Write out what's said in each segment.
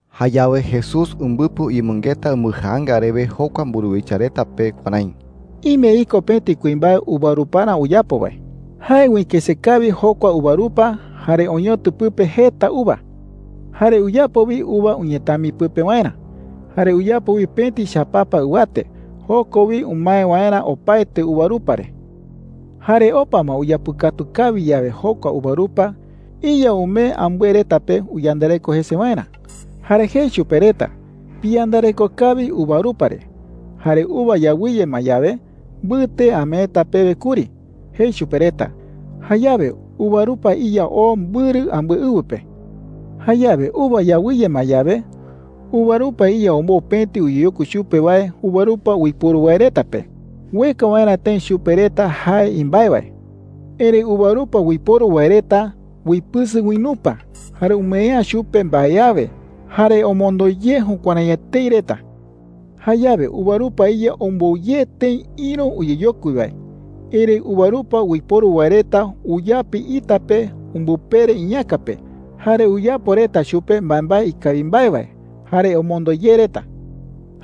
Jayawe Jesús umbɨpɨ uyemɨngeta umbɨjaanga rewe jokua mburuwicha reta pe kuärái: “Ime iko pëti kuimbae uvaruparä uyapo wae,” jei. “Jae uikëse kawi jokua uvarupa, jare oñotɨ pɨpe jeta uva,” jei. “Jare uyapo wi uva uñetami pɨpe waerä. Jare uyapo wi pëti chapapa ɨwate, joko wi umae waerä opaete uvarupa re,” jei. “Jare opa ma uyapɨkatu kawi yawe jokua uvarupa, iya umee ambɨe reta pe uyandareko jese waerä. Jare jei chupe reta: ‘Piyandareko kawi uvarupa re. Jare uva yawɨye ma yawe, mbɨte ameeta pewe kuri,’ jei chupe reta. Jayawe uvarupa iya oo mbɨrɨ ambɨe ɨwɨ pe,” jei Jesús. “Jayawe uva yawɨye ma yawe, uvarupa iya ombou pëti uyeyokui chupe wae uvarupa uiporu wae reta pe ueka waerä tëi chupe reta jae imbae wae. Erëi uvarupa uiporu wae reta uipɨsɨ uinupa, jare umee’ä chupe mbae awe. Jare omondo ye jukuärái etei reta,” jei. “Jayawe uvarupa iya ombou ye tëi ïru uyeyokui wae. Erëi uvarupa uiporu wae reta uyapi ita pe umbɨpere iñäka pe, jare uyapo reta chupe mbaembae ikawi mbae wae. Jare omondo ye reta,”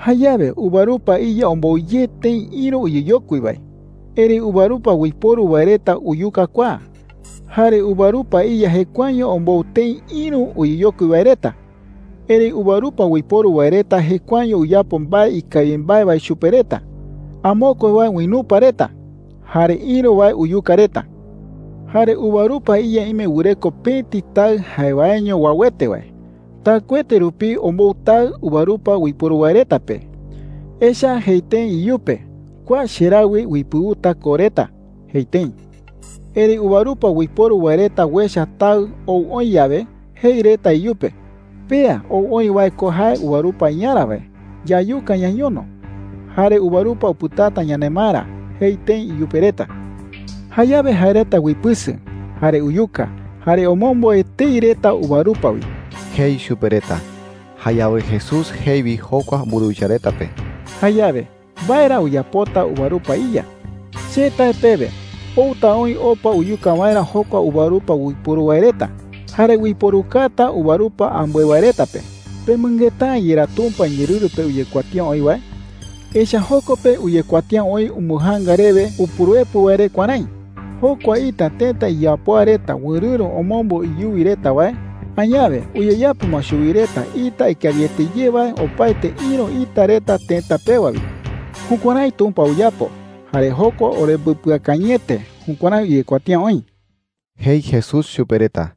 jei. “Jayawe uvarupa iya ombou ye tëi ïru uyeyokui wae. Erëi uvarupa uiporu wae reta uyuka kua. Jare uvarupa iya jekuaeño ombou tëi ïru uyeyokui wae reta, erëi uvarupa uiporu wae reta jekuaeño uyapo mbae ikawi mbae wae chupe reta. Amokue wae uinupa reta, jare ïru wae uyuka reta,” jei chupe reta. “Jare uvarupa iya ime wɨreko pëti taɨ jae waeño uauete wae. Taɨkuete rupi ombou taɨ uvarupa uiporu wae reta pe. Echa’ä jei tëi iyupe: ‘Kua cheraɨ wi uipɨuta ko reta,’ jei tëi. Erëi uvarupa uiporu wae reta uecha taɨ ou oï yawe, jei reta iyupe: ‘Pea ou oï wae ko jae uvarupa iyarä wae. Yayuka ñañono, jare uvarupa upɨtata yanemaerä,’ jei tëi iyupe reta. Jayawe jae reta uipɨsɨ, jare uyuka, jare omombo etei reta uvarupa wi,” jei chupe reta. Jayawe Jesús jei wi jokua mburuwicha reta pe: “Jayawe, ¿mbae ra uyapota uvarupa iya?” jei chupe reta. “Che tae pewe, outa oï opa uyuka waerä jokua uvarupa uiporu wae reta, jare uiporukata uvarupa ambɨe wae reta pe,” jei chupe reta. “¿Pemɨngeta’ä yerá Tumpa iñeerɨru pe uyekuatía oï wae? Echa’ä joko pe uyekuatía oï umbɨjaanga rewe Upuruepɨ wae re kuärái: ‘Jokua ita tëta iyapoa reta wɨrɨ̈ro omombo iyuwi reta wae, añawe uyeyapo ma chuwi reta ita ikawiete ye wae opaete ïru ita reta tëta pewa wi. Jukuärái Tumpa uyapo. Jare jokua orembɨpɨakañɨete.’ Jukuärái uyekuatía oï,” jei Jesús chupe reta.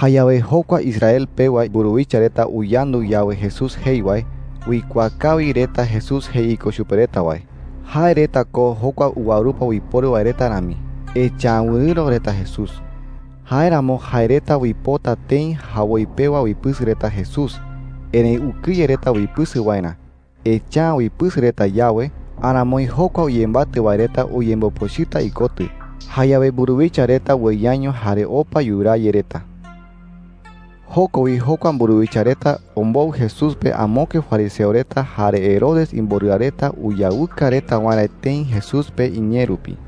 Jayawe jokua Israel pewa mburuwicha reta uyandu yawe Jesús jei wae, uikuaa kawi reta Jesús jei iko chupe reta wae – jae reta ko jokua uvarupa uiporu wae reta rami, echa’ä wɨrɨ̈ro reta Jesús. Jáeramo jae reta uipota tëi jawoi pewa uipɨsɨka reta Jesús. Erëi ukɨye reta uipɨsɨka waerä. Echa’ä uipɨsɨka reta yawe, aramoi jokua uyembatɨ wae reta uyembopochɨta ikotɨ. Jayawe mburuwicha reta ueyaño jare opa yuraa ye reta. Joko wi jokua mburuwicha reta ombou Jesús pe amokue fariseo reta jare Herodes imborɨa reta, uyawɨka reta waerä tëi Jesús pe iñee rupi.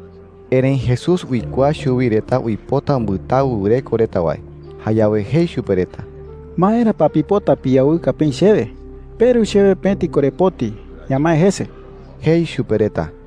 Erëi Jesús uikuaa chuwi reta uipota umbɨtawɨ wɨreko reta wae. Jayawe jei chupe reta: “¿Maera pa pipota piyawɨka peï chewe? Peru chewe pëti korepoti; ñamae jese,” jei chupe reta.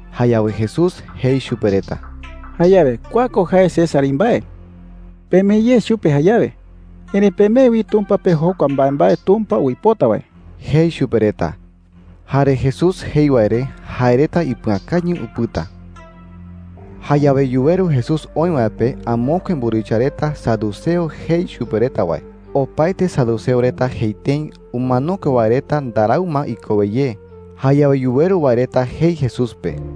Jayawe Jesús jei chupe reta: “Jayawe kua ko jae César imbae. Pemee ye chupe jayawe. Erëi pemee wi Tumpa pe jokua mbaembae Tumpa uipota wae,” jei chupe reta. Jare Jesús jei wae re jae reta ipɨakañɨ upɨta. Jayawe yuweru Jesús oï wae pe amokue mburuwicha reta, saduceo jei chupe reta wae. Opaete saduceo reta jei tëi umanokue wae reta ndarau ma ikowe ye. Jayawe yuweru wae reta jei Jesús pe: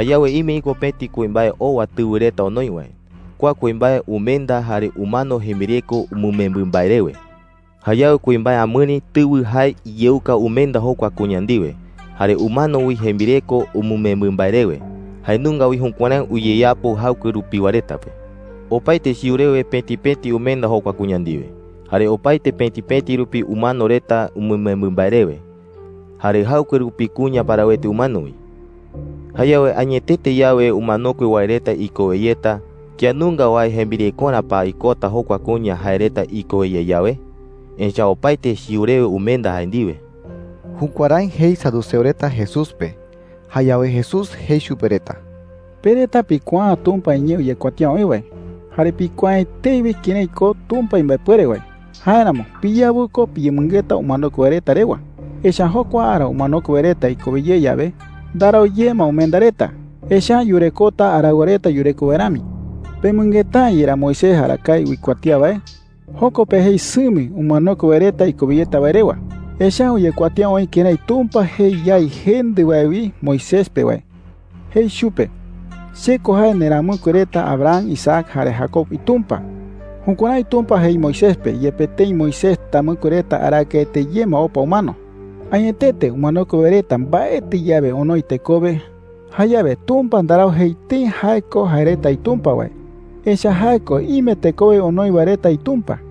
“Jayawe ime iko pëti kuimbae owa tɨwɨ reta onoi wae. Kua kuimbae umenda, jare umano jembireko umɨmembɨ mbae rewe,” jei reta. “Jayawe kuimbae amɨri tɨwɨ jae iyeuka umenda jokua kuña ndiwe, jare umano wi jembireko umɨmembɨ mbae rewe. Jae nunga wi jukuärái uyeyapo jaɨkue rupiwa reta pe. Opaete chiu rewe pëti pëti umenda jokua kuña ndiwe, jare opaete pëti pëti rupi umano reta umɨmembɨ mbae rewe. Jare jaɨkue rupi kuña parawete umano wi,” jei reta. “Jayawe añetete yawe umanokue wae reta ikowe yeta, ¿kía nunga wae jembirekorä pa ikota jokua kuña jae reta ikowe ye yawe? Echa’ä opaete chiu rewe umenda jae ndiwe.” Jukuärái jei saduceo reta Jesús pe. Jayawe Jesús jei chupe reta: “Pe reta pikuaa’ä Tumpa iñee uyekuatía oï wae, jare pikuaa’ä etei wi kërái ko Tumpa imbaepuere wae. Jáeramo piyawɨ ko piyemɨngeta umanokue wae reta rewa. Echa’ä jokua ara umanokue wae reta ikowe ye yawe, ndarau ye ma umenda reta. Echa’ä yurekota araɨwa reta yureko wae rami,” jei chupe reta. “¿Pemɨngeta’ä yerá Moisés arakae uikuatía wae? Joko pe jei sɨmi umanokue wae reta ikowe yeta wae rewa,” jei. “Echa’ä uyekuatía oï kërái Tumpa jei yái jendɨ wae wi Moisés pe wae. Jei chupe: ‘Che ko jae nderamɨkue reta Abraham, Isaac, jare Jacob iTumpa.’ Jukuärái Tumpa jei Moisés pe yepe tëi Moisés tamɨkue reta arakaete ye ma opa umano,” jei. “Añetete umanokue wae reta mbaetɨ yawe onoi tekowe, jayawe Tumpa ndarau jei tëi jae ko jae reta iTumpa wae, echa’ä jae ko ime tekowe onoi wae reta iTumpa,” jei.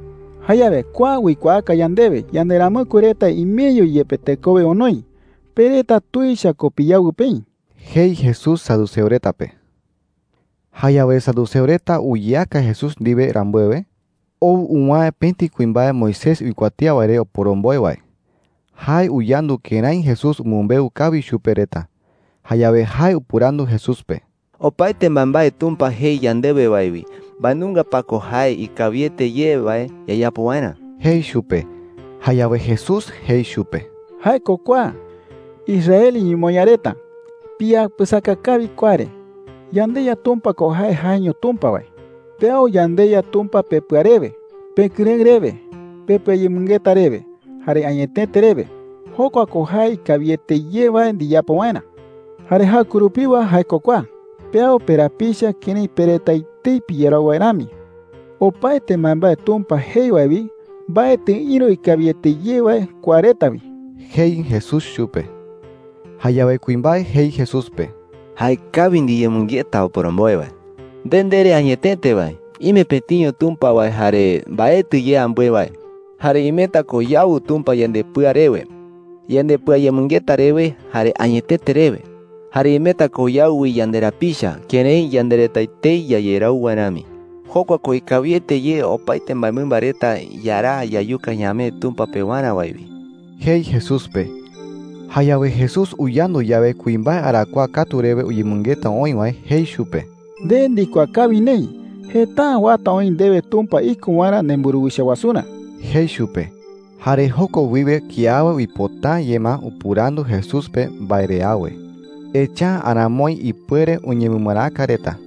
“Jayawe kua uikuaaka yandewe yanderamɨkue reta imeño yepe tekowe onoi. Pe reta tuicha ko piyawɨ peï,” jei Jesús saduceo reta pe. Jayawe saduceo reta uyeaka Jesús ndiwe rambuewe, ou uwäe pëti kuimbae Moisés uikuatía wae re oporomboe wae. Jae uyandu kërái Jesús umɨmbeu kawi chupe reta. Jayawe jae upɨrandu Jesús pe: “Opaete mbaembae Tumpa jei yandewe wae wi, ¿mbae nunga pa ko jae ikawiete ye wae yayapo waerä?” jei chupe. Jayawe Jesús jei chupe: “Jae ko kua: ‘Israel iñemoñaa reta, piyapɨsaka kawi kua re. YandeYa Tumpa ko jae jaeño Tumpa wae. Peau yandeYa Tumpa pepɨa rewe, pekɨrëɨ rewe, pepɨayemɨngeta rewe, jare añetete rewe.’ Jokua ko jae ikawiete ye wae ndiyapo waerä,” jei chupe. “Jare jaɨkue rupiwa jae ko kua: ‘Peau perapicha kërái pe reta etei piyerau wae rami.’ Opaete mbaembae Tumpa jei wae wi, mbaetɨ ïru ikawiete ye wae kua reta wi,” jei Jesús chupe. Jayawe kuimbae jei Jesús pe: “Jaekawi ndiyemɨngeta, oporomboe wae,” jei chupe. “Nde ndere añetete wae, ime pëtiño Tumpa wae jare mbaetɨ ye ambɨe wae,” jei. “Jare imeta ko yaau Tumpa yandepɨa rewe, yandepɨayemɨngeta rewe, jare añetete rewe. Jare imeta ko yaau wi yanderapicha kërái yande reta etei yayerau wae rami,” jei. “Jokua ko ikawiete ye opaete mbaemɨmba reta yaraa yayuka ñamee Tumpa pewarä wae wi,” jei Jesús pe. Jayawe Jesús uyandu yawe kuimbae arakuaa katu rewe uyemɨngeta oï wae, jei chupe: “Nde ndikuaa kawi neï. Jeta’ä uata oï ndewe Tumpa iko waerä nemburuwicha wasurä,” jei chupe. Jare joko wiwe kiawe uipota’ä ye ma upɨrandu Jesús pe mbae re awe, echa’ä aramoi ipuere uñemɨmaraka reta.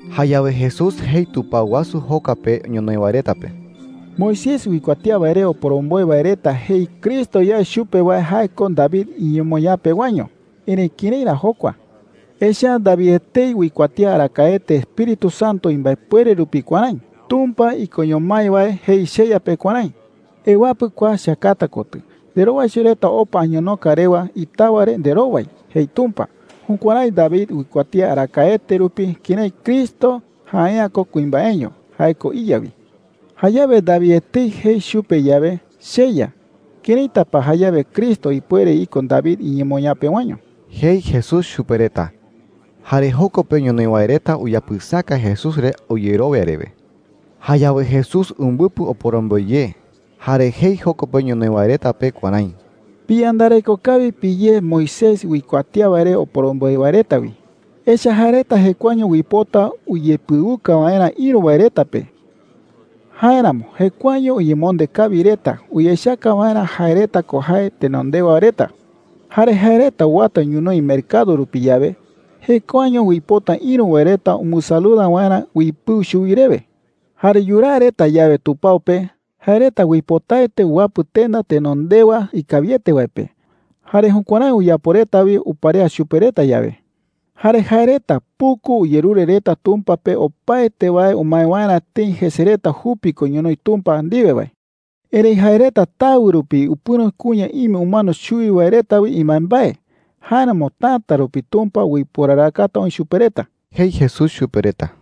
Jayawe Jesús jei tupao wasu joka pe ñonoï wae reta pe: “Moisés uikuatía wae re oporomboe wae reta jei Cristo yae chupe wae jae ko David iñemoñaa pewaño. Erëi, ¿kërái ra jokua? Echa’ä David etei uikuatía arakaete Espíritu Santo imbaepuere rupi kuärái: ‘Tumpa ikoño mái wae jei cheYa pe kuärái: ‘Ewapɨ kua cheakata kotɨ, nderowaicho reta opa añonoka rewa itawa re nderowai,’ jei Tumpa.’ Jukuärái David uikuatía arakaete rupi kërái Cristo jae’ä ko kuimbaeño. Jae ko iYa wi. Jayawe David etei jei chupe yawe, ‘CheYa,’ ¿këraita pa jayawe Cristo ipuere iko David iñemoñaa pewaño?” jei Jesús chupe reta. Jare joko pe ñonoï wae reta uyapɨsaka Jesús re uyerowia rewe. Jayawe Jesús umbɨpɨ oporomboe ye, jare jei joko pe ñonoï wae reta pe kuärái: “Piyandareko kawi piyé Moisés uikuatía wae re oporomboe wae reta wi,” jei chupe reta. “Echa’ä jae reta jekuaeño uipota uyepɨuka waerä ïru wae reta pe. Jáeramo jekuaeño uyemonde kawi reta uyechaka waerä jae reta ko jae tenondewa reta,” jei. “Jare jae reta uwata ñonoï mercado rupi yawe, jekuaeño uipota ïru wae reta umbɨsaluda waerä uipɨu chuwi rewe,” jei. “Jare yuraa reta yawe tupao pe, jae reta uipotaete uwapɨ tenda tenondewa ikawiete wae pe. Jare jukuärái uyapo reta wi uparea chupe reta yawe,” jei. “Jare jae reta puku uyerure reta Tumpa pe opaete wae umae waerä tëi jese reta jupi ko ñonoï Tumpa ndiwe wae. Erëi jae reta tawɨ rupi upɨ̈ro kuña ime umano chuwi wae reta wi imbaembae. Jáeramo täta rupi Tumpa uiporarakata oï chupe reta,” jei Jesús chupe reta.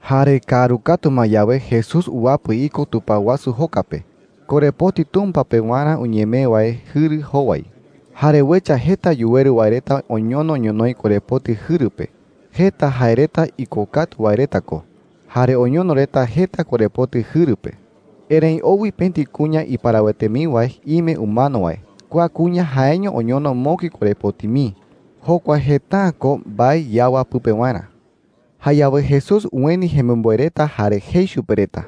Jare kaaru katu ma yawe, Jesús uwapɨ iko tupao wasu joka pe, korepoti Tumpa pewarä uñemee wae jɨru jowai. Jare uecha jeta yuweru wae reta oñono ñonoï korepoti jɨru pe. Jeta jae reta ikokatu wae reta ko, jare oñono reta jeta korepoti jɨru pe. Erëi ou wi pëti kuña iparawete mii wae ime umano wae. Kua kuña jaeño oñono mokui korepoti mii. Jokua jeta’ä ko mbae yawa pɨpe waerä. Jayawe Jesús ueni jemimboe reta jare jei chupe reta: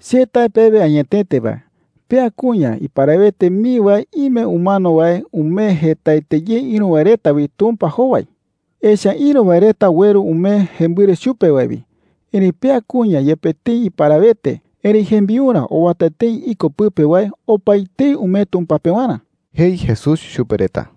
“Che tae pewe añetete wae, pea kuña iparawete mii wae ime umano wae umee jetaete ye ïru wae reta wi Tumpa jowai,” jei. “Echa’ä ïru wae reta ueru umee jembɨre chupe wae wi. Erëi pea kuña, yepe tëi iparawete, erëi jembiurä owata tëi iko pɨpe wae opaetei umee Tumpa pewarä,” jei Jesús chupe reta.